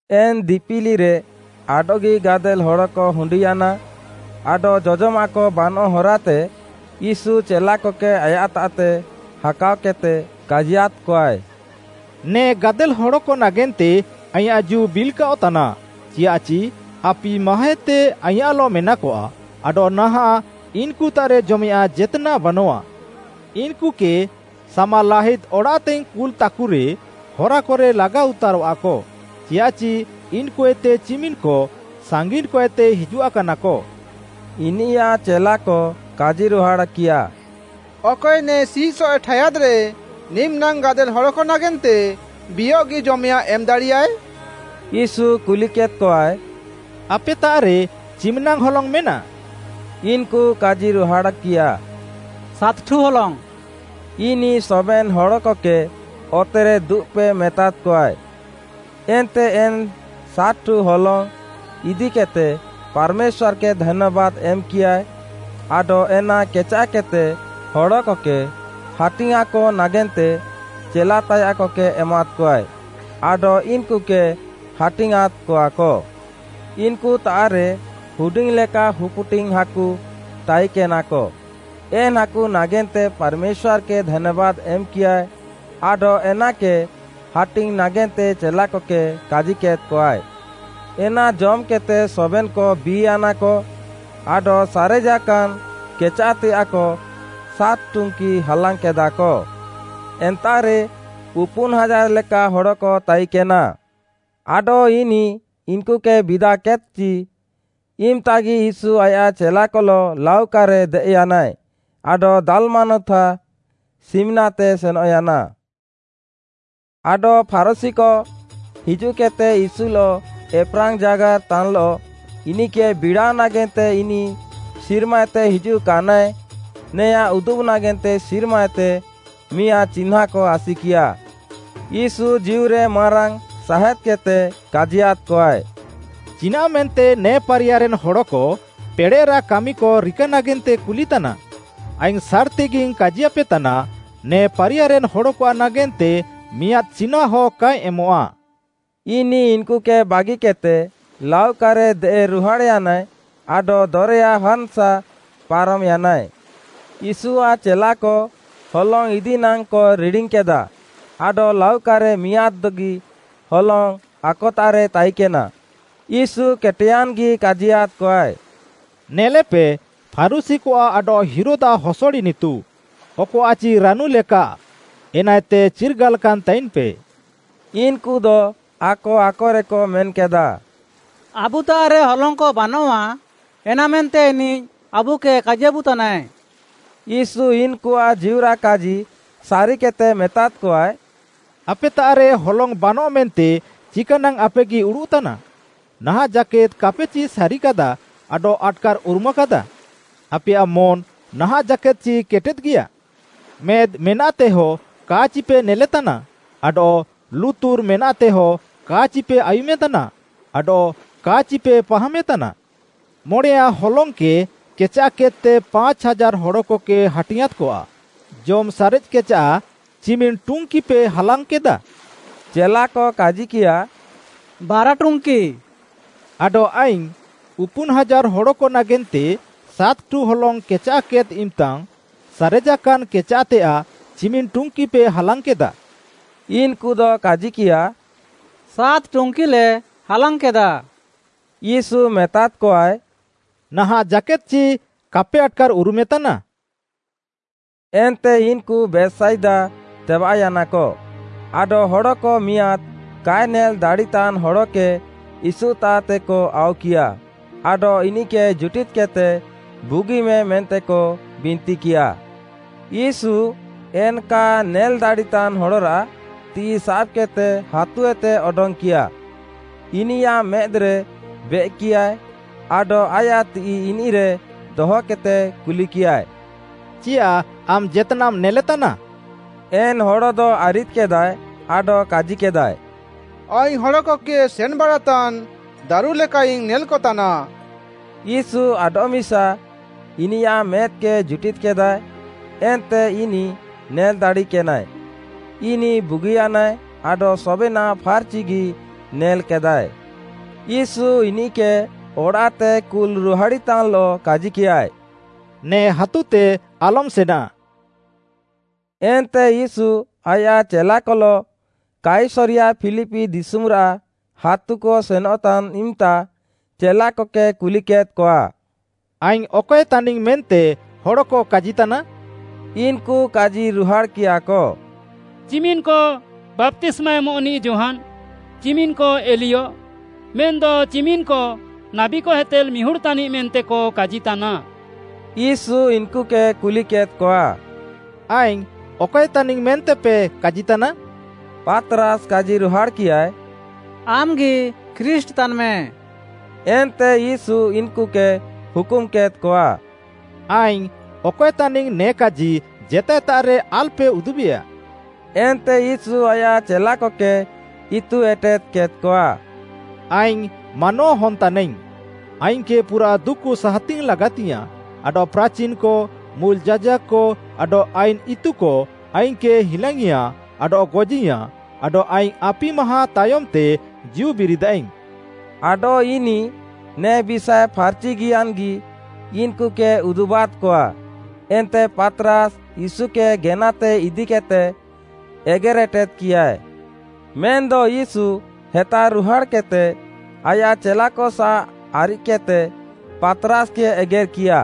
ଏନ୍‌ ଦିପିଲିରେ ଆଡଃଗି ଗାଦେଲ୍‌ ହଡ଼କ ହୁଣ୍ଡିୟାନା, ଆଡଃ ଜଜମାଃକ ବାନଃ ହରାତେ, ୟୀଶୁ ଚେଲାକକେ ଆୟାଃତାଃତେ ହାକାଅକେଦ୍‌ତେ କାଜିୟାଦ୍‌କଆଏ, “ନେ ଗାଦେଲ୍‌ ହଡ଼କ ନାଗେନ୍ତେ ଆଇଁୟାଃ ଜୀଉ ବିଲ୍‌କାଅଃତାନା, ଚିୟାଃଚି ଆପି ମାହାଁଏତେ ଆଇଁୟାଃଲଃ ମେନାକଆ, ଆଡଃ ନାହାଁଃ ଇନ୍‌କୁତାଃରେ ଜମେୟାଃଁ ଜେତ୍‌ନାଃ ବାନଃଆ। ଇନ୍‌କୁକେ ସାମାଲାହିଦ୍ ଅଡ଼ାଃତେଇଙ୍ଗ୍‌ କୁଲ୍‌ତାକୁରେ ହରାକରେ ଲାଗାଉତାରଃଆକ, ଚିୟାଃଚି ଇନ୍‌କୁଏତେ ଚିମିନ୍‌କ ସାଙ୍ଗିନ୍‌କଏତେ ହିଜୁଆକାନାକ।” ଇନିୟାଃ ଚେଲାକ କାଜିରୁହାଡ଼୍‌କିୟା, “ଅକଏ ନେ ସିଃସଏଃ ଠାୟାଦ୍‌ରେ ନିମିନାଙ୍ଗ୍‌ ଗାଦେଲ୍‌ ହଡ଼କ ନାଗେନ୍ତେ ବିୟଃଗି ଜମେୟାଃଁ ଏମ୍‌ଦାଡ଼ିୟାଏ?” ୟୀଶୁ କୁଲିକେଦ୍‌କଆଏ, “ଆପେତାଃରେ ଚିମିନାଙ୍ଗ୍‌ ହଲଙ୍ଗ୍‌ ମେନା?” ଇନ୍‌କୁ କାଜିରୁହାଡ଼୍‌କିୟା, “ସାତ୍‌ଠୁ ହଲଙ୍ଗ୍‌।” ଇନିଃ ସବେନ୍‌ ହଡ଼କକେ ଅତେରେ ଦୁବ୍‌ପେ ମେତାଦ୍‌କଆଏ। ଏନ୍ତେ ଏନ୍‌ ସାତ୍‌ଠୁ ହଲଙ୍ଗ୍‌ ଇଦିକେଦ୍‌ତେ ପାର୍‌ମେଶ୍ୱାର୍‌କେ ଧାନ୍ୟାବାଦ୍‌ ଏମ୍‌କିୟାଏ, ଆଡଃ ଏନା କେଚାଃକେଦ୍‌ତେ ହଡ଼କକେ ହାଟିଙ୍ଗ୍‌ଆଁକ ନାଗେନ୍ତେ ଚେଲାତାୟାଃକକେ ଏମାଦ୍‌କଆଏ, ଆଡଃ ଇନ୍‌କୁକେ ହାଟିଙ୍ଗ୍‌ଆଁଁଦ୍‌କଆକ। ଇନ୍‌କୁତାଃରେ ହୁଡିଙ୍ଗ୍‌ଲେକା ହୁପ୍‌ଡିଙ୍ଗ୍‌ ହାକୁ ତାଇକେନାକ, ଏନ୍‌ ହାକୁ ନାଗେନ୍ତେ ପାର୍‌ମେଶ୍ୱାର୍‌କେ ଧାନ୍ୟାବାଦ୍‌ ଏମ୍‌କିୟାଏ, ଆଡଃ ଏନାକେ ହାଟିଙ୍ଗ୍‌ ନାଗେନ୍ତେ ଚେଲାକକେ କାଜିକେଦ୍‌କଆଏ। ଏନା ଜମ୍‌କେଦ୍‌ତେ ସବେନ୍‌କ ବି'ୟାନାକ, ଆଡଃ ସାରେଜାକାନ୍ କେଚାଃତେୟାଃକ ସାତ୍‌ ଟୁଙ୍କି ହାଲାଙ୍ଗ୍‌କେଦାଃକ। ଏନ୍ତାଃରେ ଉପୁନ୍‌ ହାଜାର୍‌ ଲେକା ହଡ଼କ ତାଇକେନା। ଆଡଃ ଇନିଃ ଇନ୍‌କୁକେ ବିଦାକେଦ୍‌କଚି, ଇମ୍‌ତାଗି ୟୀଶୁ ଆୟାଃ ଚେଲାକଲଃ ଲାଉକାରେ ଦେଏଃୟାନାଏ, ଆଡଃ ଦାଲ୍‌ମାନୁଥା ସିମ୍‌ନାତେ ସେନଃୟାନା। ଆଡଃ ଫାରୁଶୀକ ହିଜୁଃକେଦ୍‌ତେ ୟୀଶୁଲଃ ଏପ୍‌ରାଙ୍ଗ୍‌ଜାଗାର୍‌ ତାନ୍‌ଲଃ, ଇନିଃକେ ବିଡ଼ାଅ ନାଗେନ୍ତେ ଇନିଃ ସିର୍ମାଏତେ ହିଜୁଆକାନାଏ, ନେଆଁଁ ଉଦୁବ୍‌ ନାଗେନ୍ତେ ସିର୍ମାଏତେ ମିଆଁଦ୍‌ ଚିହ୍ନାଁକ ଆସିକିୟା। ୟୀଶୁ ଜୀଉରେ ମାରାଙ୍ଗ୍‌ ସାହେଁଦ୍‌କେଦ୍‌ତେ କାଜିୟାଦ୍‌କଆଏ, “ଚିନାଃମେନ୍ତେ ନେ ପାରିୟାରେନ୍‌ ହଡ଼କ ପେଡ଼େଃରାଃ କାମିକ ରିକା ନାଗେନ୍ତେ କୁଲିତାନା? ଆଇଙ୍ଗ୍‌ ସାର୍‌ତିଗିଙ୍ଗ୍‌ କାଜିୟାପେତାନା, ନେ ପାରିୟାରେନ୍‌ ହଡ଼କଆଃ ନାଗେନ୍ତେ ମିଆଁଦ୍‌ ଚିହ୍ନାଁହ କା ଏମଃଆ।” ଇନିଃ ଇନ୍‌କୁକେ ବାଗିକେଦ୍‌ତେ, ଲାଉକାରେ ଦେଏଃରୁହାଡ଼୍‌ୟାନାଏ ଆଡଃ ଦରେୟା ହାନ୍‌ସାଃ ପାରମ୍‌ୟାନାଏ। ୟୀଶୁଆଃ ଚେଲାକ ହଲଙ୍ଗ୍‌ ଇଦି ନାଙ୍ଗ୍‌କ ରିଡ଼ିଙ୍ଗ୍‌କେଦା ଆଡଃ ଲାଉକାରେ ମିଆଁଦ୍‌ଗି ହଲଙ୍ଗ୍‌ ଆକତାଃରେ ତାଇକେନା, ୟୀଶୁ କେଟେୟାନ୍‌ଗି କାଜିୟାଦ୍‌କଆଏ, “ନେଲେପେ, ଫାରୁଶୀକଆଃ ଆଡଃ ହେରୋଦ୍‌ଆଃ ହସଡ଼ ଇନିତୁ, ଅକଆଃଚି ରାନୁ ଲେକାଃ ଏନାଏତେ ଚିର୍ଗାଲାକାନ୍‌ ତାଇନ୍‌ପେ।” ଇନ୍‌କୁଦ ଆକ ଆକରେକ ମେନ୍‌କେଦା, “ଆବୁତାଃରେ ହଲଙ୍ଗ୍‌କ ବାନଆଃ ଏନାମେନ୍ତେ ଇନିଃ ଆବୁକେ କାଜିୟାବୁତାନାଏ।” ୟୀଶୁ ଇନ୍‌କୁଆଃ ଜୀଉରାଃ କାଜି ସାରିକେଦ୍‌ତେ ମେତାଦ୍‌କଆଏ, “ଆପେତାଃରେ ହଲଙ୍ଗ୍‌ ବାନଃ ମେନ୍ତେ ଚିକାନାଙ୍ଗ୍‌ ଆପେଗି ଉଡ଼ୁଃତାନା? ନାହାଁଃ ଜାକେଦ୍‌ କାପେଚି ସାରିକାଦା ଆଡଃ ଆଟ୍‌କାର୍‌ଉରୁମାକାଦା? ଆପେୟାଃ ମନ୍‌ ନାହାଁଃ ଜାକେଦ୍‌ଚି କେଟେଦ୍‌ଗିୟା? ମେଦ୍‌ ମେନାଃତେହ କା ଚିପେ ନେଲେତାନା? ଆଡଃ ଲୁତୁର୍‌ ମେନାଃତେହ କା ଚିପେ ଆୟୁମେତାନା? ଆଡଃ କା ଚିପେ ପାହାମେତାନା? ମଣେୟାଁ ହଲଙ୍ଗ୍‌କେ କେଚାଃକେଦ୍‌ତେ ପାଞ୍ଚ୍‌ ହାଜାର୍‌ ହଡ଼କକେ ହାଟିଙ୍ଗ୍‌ଆଁଁଦ୍‌କଆ, ଜମ୍‌ ସାରେଜ୍‌କେଚାଃ ଚିମିନ୍‌ ଟୁଙ୍କିପେ ହାଲାଙ୍ଗ୍‌କେଦାଃ?” ଚେଲାକ କାଜିକିୟାଃ, “ବାରା ଟୁଙ୍କି।” ଆଡଃ ଆଇଙ୍ଗ୍‌ “ଉପୁନ୍‌ ହାଜାର୍‌ ହଡ଼କ ନାଗେନ୍ତେ ସାତ୍‌ଠୁ ହଲଙ୍ଗ୍‌ କେଚାଃକେଦ୍‌ ଇମ୍‌ତାଙ୍ଗ୍‌, ସାରେଜାକାନ୍ କେଚାଃତେୟାଃ ଚିମିନ୍‌ ଟୁଙ୍କିପେ ହାଲାଙ୍ଗ୍‌କେଦାଃ?” ଇନ୍‌କୁଦ କାଜିକିୟାଃ “ସାତ୍‌ ଟୁଙ୍କିଲେ ହାଲାଙ୍ଗ୍‌କେଦା।” ୟୀଶୁ ମେତାଦ୍‌କଆଏ, “ନାହାଁଃ ଜାକେଦ୍‌ ଚି କାପେ ଆଟ୍‌କାର୍‌ ଉରୁମେତାନା?” ଏନ୍ତେ ଇନ୍‌କୁ ବେଥ୍‌ସାଇଦା ତେବାଃୟାନାକ, ଆଡଃ ହଡ଼କ ମିଆଁଦ୍‌ କାଏ ନେଲ୍‌ ଦାଡ଼ିତାନ୍‌ ହଡ଼କେ ୟୀଶୁତାଃତେକ ଆଉକିୟା ଆଡଃ ଇନିଃକେ ଜୁଟିଦ୍‌କେଦ୍‌ତେ ବୁଗିମେ ମେନ୍ତେକ ବିନ୍ତିକିୟା। ୟୀଶୁ, ଏନ୍‌ କା ନେଲ୍‌ ଦାଡ଼ିତାନ୍‌ ହଡ଼ରାଃ ତିଃଇ ସାବ୍‌କେଦ୍‌ତେ ହାତୁଏତେ ଅଡଙ୍ଗ୍‌କିୟା। ଇନିୟାଃ ମେଦ୍‌ରେ ବେଏକ୍‌କିୟାଏ ଆଡଃ ଆୟାଃ ତିଃଇ ଇନିଃରେ ଦହକେଦ୍‌ତେ କୁଲିକିୟାଏ, “ଚିୟାଃ ଆମ୍‌ ଜେତ୍‌ନାଃମ୍‌ ନେଲେତାନା?” ଏନ୍‌ ହଡ଼ଦ ଆରିଦ୍‌କେଦାଏ ଆଡଃ କାଜିକେଦାଏ, “ଆଇଙ୍ଗ୍‌ ହଡ଼କକେ ସେନ୍‌ବାଡ଼ାତାନ୍‌ ଦାରୁଲେକାଇଙ୍ଗ୍‌ ନେଲ୍‌କତାନା।” ୟୀଶୁ ଆଡଃମିସା ଇନିୟାଃ ମେଦ୍‌କେ ଜୁଟିଦ୍‌କେଦାଏ, ଏନ୍ତେ ଇନିଃ ନେଲ୍‌ ଦାଡ଼ିକେନାଏ, ଇନିଃ ବୁଗିୟାନାଏ ଆଡଃ ସବେନାଃ ଫାର୍‌ଚିଗି ନେଲ୍‌କେଦାଏ। ୟୀଶୁ ଇନିଃକେ ଅଡ଼ାଃତେ କୁଲ୍‌ ରୁହାଡ଼ିତାନ୍‌ଲଃ କାଜିକିୟାଏ, “ନେ ହାତୁତେ ଆଲମ୍‌ ସେନାଃ।” ଏନ୍ତେ ୟୀଶୁ ଆୟାଃ ଚେଲାକଲଃ କାଇସରିୟା ଫିଲିପି ଦିଶୁମ୍‌ରାଃ ହାତୁକ ସେନଃତାନ୍‌ ଇମ୍‌ତା ଚେଲାକକେ କୁଲିକେଦ୍‌କଆ, “ଆଇଙ୍ଗ୍‌ ଅକଏ ତାନିଙ୍ଗ୍‌ ମେନ୍ତେ ହଡ଼କ କାଜିତାନା?” ଇନ୍‌କୁ କାଜିରୁହାଡ଼୍‌କିୟାକ, “ଚିମିନ୍‌କ ବାପ୍ତିସ୍ମା ଏମଃନିଃ ଯୋହାନ୍‌, ଚିମିନ୍‌କ ଏଲିୟ ମେନ୍‌ଦ ଚିମିନ୍‌କ ନାବୀକଏତେ ମିହୁଡ଼୍‌ ତାନିଃ ମେନ୍ତେକ କାଜିତାନା।” ୟୀଶୁ ଇନ୍‌କୁକେ କୁଲିକେଦ୍‌କଆ, “ଆଇଙ୍ଗ୍‌ ଅକଏ ତାନିଙ୍ଗ୍‌ ମେନ୍ତେପେ କାଜିତାନା?” ପାତ୍‌ରାସ୍‌ କାଜିରୁହାଡ଼୍‌କିୟାଏ, “ଆମ୍‌ଗି ଖ୍ରୀଷ୍ଟ୍‌, ତାନ୍‌ମେ।” ଏନ୍ତେ ୟୀଶୁ ଇନ୍‌କୁକେ ହୁକୁମ୍‌କେଦ୍‌କଆ, “ଆଇଙ୍ଗ୍‌ ଅକଏ ତାନିଙ୍ଗ୍‌ ନେ କାଜି ଜେତାଏତାଃରେ ଆଲ୍‌ପେ ଉଦୁବେୟାଃ।” ଏନ୍ତେ ୟୀଶୁ ଆୟାଃ ଚେଲାକକେ ଇତୁ ଏଟେଦ୍‌କେଦ୍‌ଆଏ, “ଆଇଙ୍ଗ୍‌ ମାନୱାହନ୍‌ ତାନାଇଙ୍ଗ୍‌, ଆଇଙ୍ଗ୍‌କେ ପୁରାଃ ଦୁକୁ ସାହାତିଙ୍ଗ୍‌ ଲାଗାତିୟାଃଁ, ଆଡଃ ପ୍ରାଚିନ୍‌କ, ମୁଲ୍‌ ଯାଜାକ୍‌କ ଆଡଃ ଆଇନ୍‌ ଇତୁକ ଆଇଙ୍ଗ୍‌କେ ହିଲାଙ୍ଗ୍‌ଇଁୟା ଆଡଃ ଗଜିୟାଁ, ଆଡଃ ଆଇଙ୍ଗ୍‌ ଆପି ମାହାଁ ତାୟମ୍‌ତେ ଜୀଉ ବିରିଦାଇଙ୍ଗ୍‌।” ଆଡଃ ଇନିଃ ନେ ବିଷାଏ ଫାର୍‌ଚିଆନ୍‌ଗି ଇନ୍‌କୁକେ ଉଦୁବାଦ୍‌କଆ। ଏନ୍ତେ ପାତ୍‌ରାସ୍‌ ୟୀଶୁକେ ଗେନାତେ ଇଦିକିଃତେ ଏଗେର୍‌ଏଟେଦ୍‌କିୟାଏ। ମେନ୍‌ଦ ୟୀଶୁ ହେତାରୁହାଡ଼୍‌କେଦ୍‌ତେ ଆୟାଃ ଚେଲାକସାଃ ଆରିଦ୍‌କେଦ୍‌ତେ, ପାତ୍‌ରାସ୍‌କେ ଏଗେର୍‌କିୟା,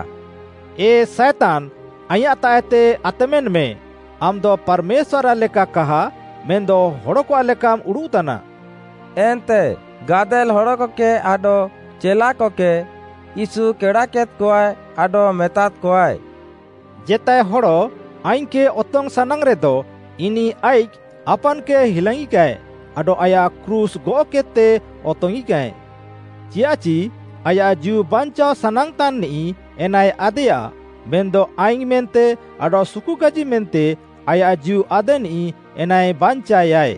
“ଏ ସାଏତାନ୍‌ ଆଇଁୟାଃତାଃଏତେ ଆତମେନ୍‌ମେ ଆମ୍‌ଦ ପାର୍‌ମେଶ୍ୱାର୍‌ଆଃ ଲେକା କାହା ମେନ୍‌ଦ ହଡ଼କଆଃ ଲେକାମ୍ ଉଡ଼ୁଃତାନା।” ଏନ୍ତେ, ଗାଦେଲ୍‌ ହଡ଼କକେ ଆଡଃ ଚେଲାକକେ, ୟୀଶୁ କେଡ଼ାକେଦ୍‌କଆଏ ଆଡଃ ମେତାଦ୍‌କଆଏ, “ଜେତାଏ ହଡ଼ ଆଇଙ୍ଗ୍‌କେ ଅତଙ୍ଗ୍‌ ସାନାଙ୍ଗ୍‌ରେଦ ଇନିଃ ଆଇଃକ୍‌ ଆପାନ୍‌କେ ହିଲାଙ୍ଗ୍‌ଇକାଏ, ଆଡଃ ଆୟାଃ କ୍ରୁଶ୍‌ ଗଅଃକେଦ୍‌ତେ ଅତଙ୍ଗ୍‌ଇଙ୍ଗ୍‌କାଏ। ଚିୟାଃଚି ଆୟାଃ ଜୀଉ ବାଞ୍ଚାଅ ସାନାଙ୍ଗ୍‌ତାନ୍‌ନିଃ ଏନାଏ ଆଦେୟା, ମେନ୍‌ଦ ଆଇଙ୍ଗ୍‌ ମେନ୍ତେ ଆଡଃ ସୁକୁକାଜି ମେନ୍ତେ ଆୟାଃ ଜୀଉ ଆଦେନିଃ, ଏନାଏ ବାଞ୍ଚାଏୟା।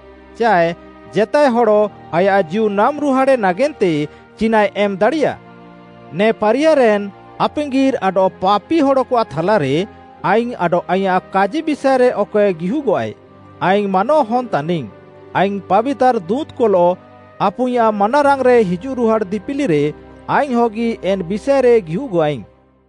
ଚାଏ ଜେତାଏ ହଡ଼ ଆୟାଃ ଜୀଉ ନାମ୍‌ରୁହାଡ଼େ ନାଗେନ୍ତେ ଚିନାଃଏ ଏମ୍‌ ଦାଡ଼ିୟା? ନେ ପାରିୟାରେନ୍‌ ଆପାଙ୍ଗିର୍‌ ଆଡଃ ପାପିହଡ଼କଆଃ ଥାଲାରେ ଆଇଙ୍ଗ୍‌ ଆଡଃ ଆଇଁୟାଃ କାଜି ବିଷାଏରେ ଅକଏ ଗିହୁଗଃଆଏ, ଆଇଙ୍ଗ୍‌ ମାନୱାହନ୍‌ ତାନିଙ୍ଗ୍‌, ଆଇଙ୍ଗ୍‌ ପାବିତାର୍‌ ଦୁଁତ୍‌କଲଃ ଆପୁଇଁୟାଃ ମାନାରାଙ୍ଗ୍‌ରେ ହିଜୁଃରୁହାଡ଼୍‌ ଦିପିଲିରେ ଆଇଙ୍ଗ୍‌ହଗି ଏନ୍‌ ବିଷାଏରେ ଗିହୁଗଃଆଇଙ୍ଗ୍‌।”